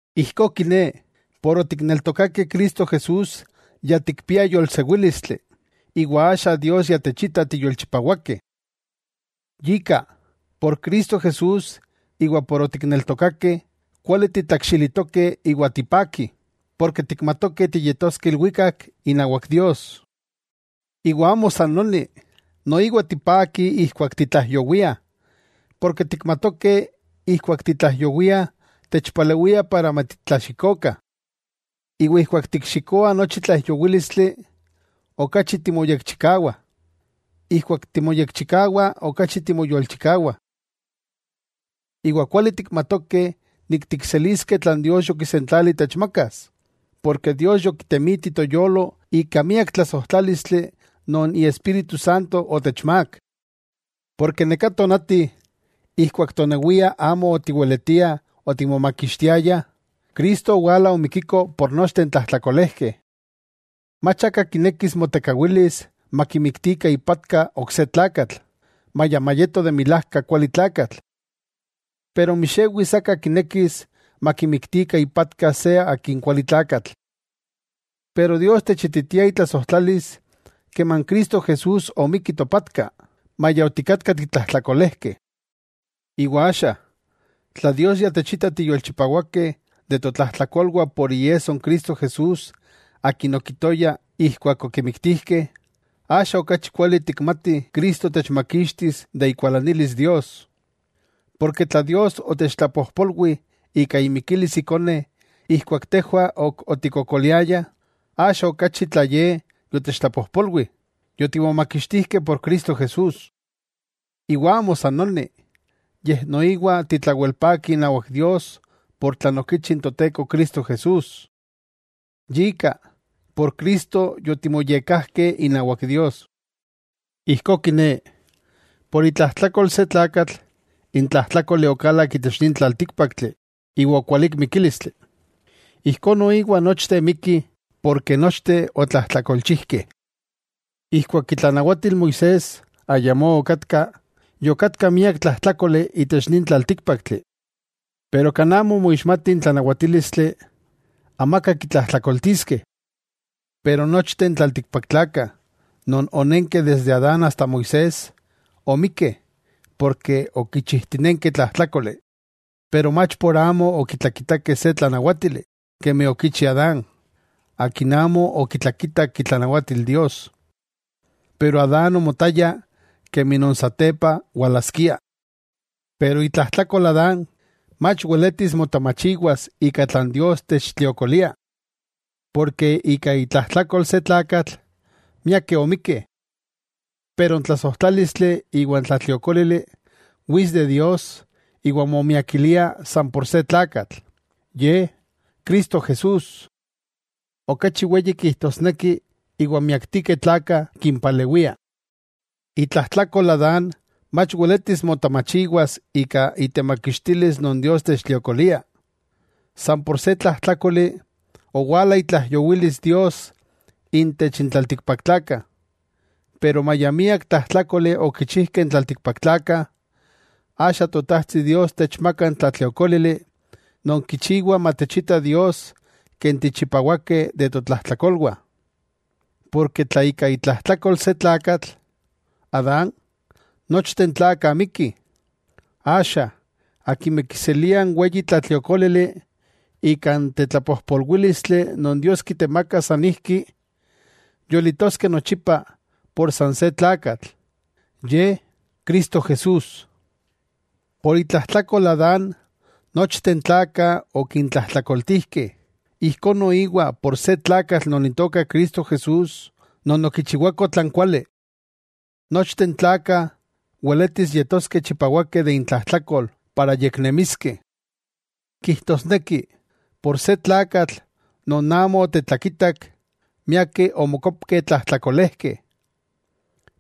Ijkó kiné, ken otikneltokakeh Cristo Jesús ya tikpiah yolsewílistli, iwa axa Dios ya techita tiyolchipawakeh. Yika, por Cristo Jesús iwa ken otikneltokakeh, kuali titlakxilitokeh iwa tipakih, porke tikmatokeh tiyetoskeh ilwikak inawak Dios. Iwa amo san noni, noiwa tipakih ijkuak titlaijyowiah, porke tikmatokeh ijkuak titlaijyowiah techpalewia para matitlaxikokah. Iwa ijkuak tikxikoah nochi tlaijyowílistli, okachi timoyekchikawah. Ijkuak timoyekchikawah okachi timoyolchikawah. Iwa kuali tikmatokeh nik tikseliskeh tlan Dios yokisentlali techmakas, porke Dios yokitemiti toyolo ika miak tlasojtlálistli non Iespíritu Santo otechmák. Porke neká tonati ijkuak tonewiah amo otiweletiah otimomakixtiayah, Cristo owala omikiko por nochteh n tlajtlakolejkeh. Mach aka kinekis motekawilis makimiktikah ipatka ok se tlakatl; maya mayeto de milajka kuali tlakatl, pero mixewis aka kinekis makimiktikah ipatka se akin kualitlakatl. Pero Dios techititia itlasojtlalis keman Cristo Jesús omikki topatka, maya otikatkah titlajtlakolejkeh. Iwa axa tla Dios ya techita tiyolchipawakeh de totlajtlakolwah por iesso n Cristo Jesús Akin okitoya ijkuak okimiktijkeh, axa okachi kuali tikmatih Cristo techmakixtis de ikualanilis Dios. Porke tla Dios otechtlapojpolwi ika imikilis Ikone ijkuak tejwah ok otikkokoliayah, axa okachi tla Ye yotechtlapojpolwi, yotimomakixtijkeh por Cristo Jesús. Iwa amo san noni, yej noiwa titlawelpakih inawak Dios por tlan okichi n Toteko Cristo Jesús. Yika, por Cristo yotimoyekkajkeh inawak Dios. Ijkó kiné, por itlajtlakol se tlakatl n tlajtlákoli okalak itech nin tlaltíkpaktli iwa okualík mikílistli, ijkó noiwa nochteh mikkih porke nochteh otlajtlakolchijkeh. Ijkuak itlanawatil Moisés ayamó okatka, yokatka miak tlajtlákoli itech nin tlaltíkpaktli. Pero kan amo moixmati n tlanawatílistli, amaka kitlajtlakoltiskeh. Pero nochteh n tlaltikpaktlakah non onenkeh desde Adán asta Moisés omikkeh porke okichijtinenkeh tlajtlákoli, pero mach por amo okitlakitakeh se tlanawátili, kemi okichi Adán; akin amo okitlakitak itlanawatil Dios. Pero Adán omotaya kemi non satepa walaskia. Pero itlajtlakol Adán, mach weletis motamachiwas ika tlan Dios techtliokolia. Porke ika itlajtlakol se tlakatl, miakeh omikkeh. Pero n tlasojtlálistli iwa n tlatliokólili wits de Dios iwa momiakilia san por se tlakatl, Ye, Cristo Jesús. Okachi weyi kijtosneki iwa miaktikeh tlakah kimpalewia. Itlajtlakol Adán mach weletis motamachiwas ika itemakixtilis non Dios techtliokolia. San por se tlajtlákoli, owala itlaijyowilis Dios intech n tlaltikpaktlakah. Pero maya miak tlajtlákoli okichijkeh n tlaltikpaktlakah, axa Totajtsi Dios techmaka n tlatliokólili non kichiwa matechita Dios ken tichipawakeh de totlajtlakolwah. Porke tla ika itlajtlakol se tlakatl, Adán, nochteh n tlakah mikkih, axa akimeh kiseliah n weyi tlatliokólili ika n tetlapojpolwílistli non Dios kitemaka sanijki, yolitoskeh nochipa san por se tlakatl, Ye, Cristo Jesús. Por itlajtlakol Adán nochteh n tlakah okintlajtlakoltijkeh, ijkó noiwa por se tlakatl non Itoka Cristo Jesús, non okichiwako tlan kuali. Nochteh n tlakah weletis yetoskeh chipawakeh de intlajtlakol para yeknemiskeh. Kijtosneki, por se tlakatl non amo otetlakitak, miakeh omokopkeh tlajtlakolejkeh.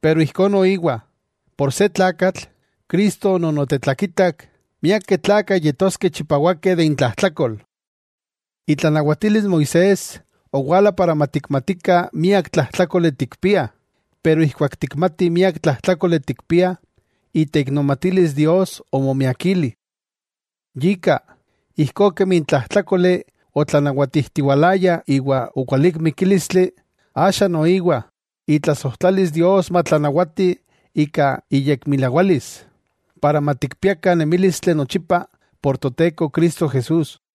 Pero ijkó noiwa, por se tlakatl, Cristo non otetlakitak, miakeh tlakah yetoskeh chipawakeh de intlajtlakol. Itlanawatilis Moisés owala para matikmatikah miak tlajtlákoli tikpiah, pero ijkuak tikmatih miak tlajtlákoli tikpiah, iteiknomatilis Dios omomiakili. Yika, ijkó kemi n tlajtlákoli otlanawatijtiwalayah iwa okualík mikílistli, axa noiwa itlasojtlalis Dios matlanawati ika iyekmilawalis para matikpiakah nemílistli nochipa, por Toteko Cristo Jesús.